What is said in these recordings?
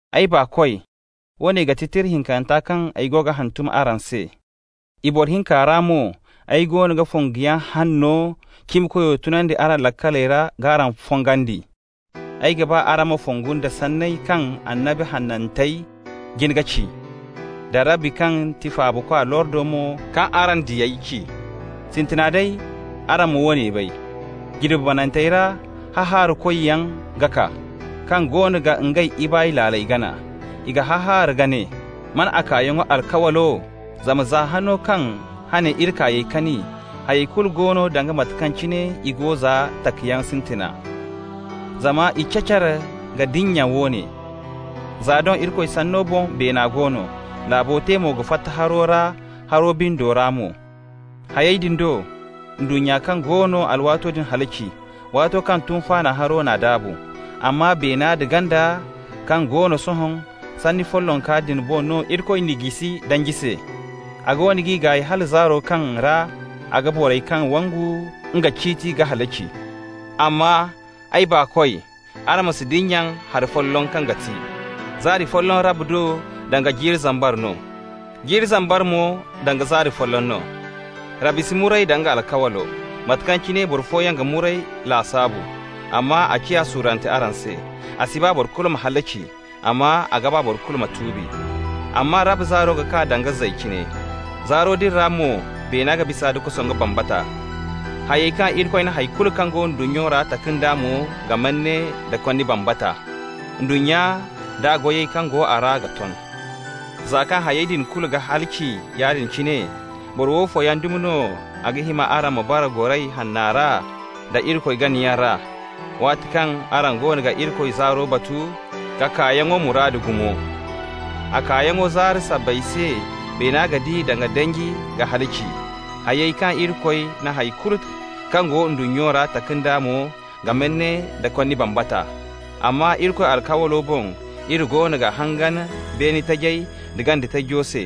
Ay baakoy, woone ga ti tira hinkanta kaŋ ay go ga hantum araŋ se. I boro hinka ra mo ay goono ga fonguyaŋ hanno cimikoyo tunandi araŋ laakaley ra k'araŋ fongandi. Ay ga ba araŋ ma fongu nda sanney kaŋ annabi hanantey jin ka ci, da Rabbi kaŋ ti Faabakwa lordo mo kaŋ araŋ diyey ci. Sintina day araŋ ma woone bay: jirbi banantey ra hahaarakoyaŋ ga kaa, kaŋ goono ga ngey ibaay laaley gana. I ga hahaara ka ne: «Man a kaayaŋo alkawlo? Zama za hano kaŋ hane iri kaayey kani, hayey kulu go no danga mate kaŋ cine i go za takayaŋ sintina.» Zama i cacar ka dinya woone: za doŋ Irikoy sanno boŋ beena go no, laabo te mo ka fatta haro ra haro bindo ra mo. Hayey din do ndunnya kaŋ go no alwaato din halaci, waato kaŋ tunfaana haro n'a daabu. Amma beena da ganda kaŋ go no sohõ, sanni follonka din boŋ no Irikoy n'i jisi danji se. A goono g'i gaay hala zaaro kaŋ ra a ga borey kaŋ yaŋ wangu nga ciiti ka halaci. Amma, ay baakoy, araŋ ma si dinya hari folloŋ kaŋ ga ti: zaari folloŋ Rabbi do danga jiiri zambar no, jiiri zambar mo danga zaari folloŋ no. Rabbi si muray da nga alkawlo, mate kaŋ cine boro fooyaŋ ga muray lasaabu, amma a ciya suurante araŋ se. A si ba boro kulu ma halaci, amma a ga ba boro kulu ma tuubi. Amma Rabbi zaaro ga kaa danga zay cine. Zaaro din ra mo beena ga bisa nda kosongu bambata. Hayey kaŋ Irikoy na hay kulu kaŋ go ndunnya ra taka nd'a mo ga manne nda konni bambata. Ndunnya da goyey kaŋ go a ra ga ton. Za kaŋ hayey din kulu ga halaci yaadin cine, boro woofo yaŋ dumi no a ga hima araŋ ma bara goray hanna ra da Irikoy ganayaŋ ra, waati kaŋ araŋ goono ga Irikoy zaaro batu k'a kaayaŋo muraadu gumo? A kaayaŋ zaaro sabbay se beena ga di da danji ka halaci. Hayey kaŋ Irikoy na hay kulu kaŋ go ndunnya ra taka nd'a mo ga manne nda konni bambata. Amma Irikoy alkawlo boŋ iri goono ga hangan beene tajey da ganda tajo se,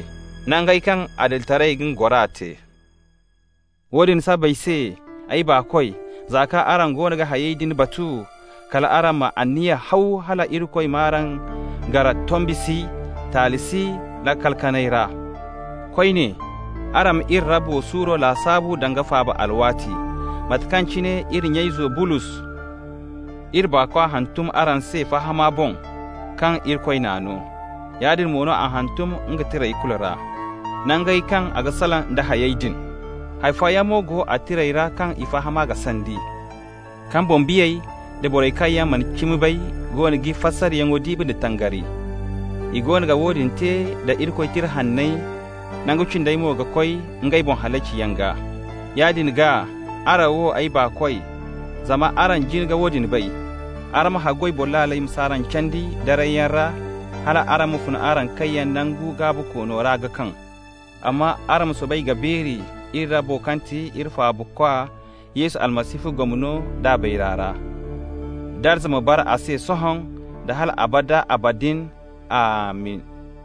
nangey kaŋ adilitaray ga nga gora te. Woodin sabbay se, ay baakoy, za kaŋ araŋ goono ga hayey din batu, kal araŋ ma anniya haw hala Irikoy m'araŋ gar tombi si, taali si laakal kanay ra. Koyne, araŋ ma iri Rabbo suuro lasaabu danga faaba alwaati, mate kaŋ cine iri nya-izo, Bulos, iri baakwa hantum araŋ se fahama boŋ kaŋ Irikoy n'a no. Yaadin mo no a hantum nga tirey kulu ra, nangey kaŋ a ga salaŋ nda hayey din. Hay fooyaŋ mo go a tirey ra kaŋ i fahama ga sandi, kaŋ boŋ-biyey da borey kaŋ yaŋ mana cimi bay goono g'i fasaryaŋo diibi nda tangari. I goono ga woodin te da Irikoy Tira Hanney nangu cindey mo ka koy ngey boŋ halaciyaŋ gaa. Yaadin gaa, araŋ wo, ay baakoy, zama araŋ jin ka woodin bay, araŋ ma haggoy boro laaley ma s'araŋ candi darayyaŋ ra hal araŋ ma fun araŋ kayyaŋ nangu gaabikoono ra ka kaŋ. Amma araŋ ma soobay ka beeri iri Rabbo kaŋ ti iri Faabakwa Yesu Almasihu gomno d'a bayra ra. Darza ma bara a se sohõ da hal abada abadin. Amin!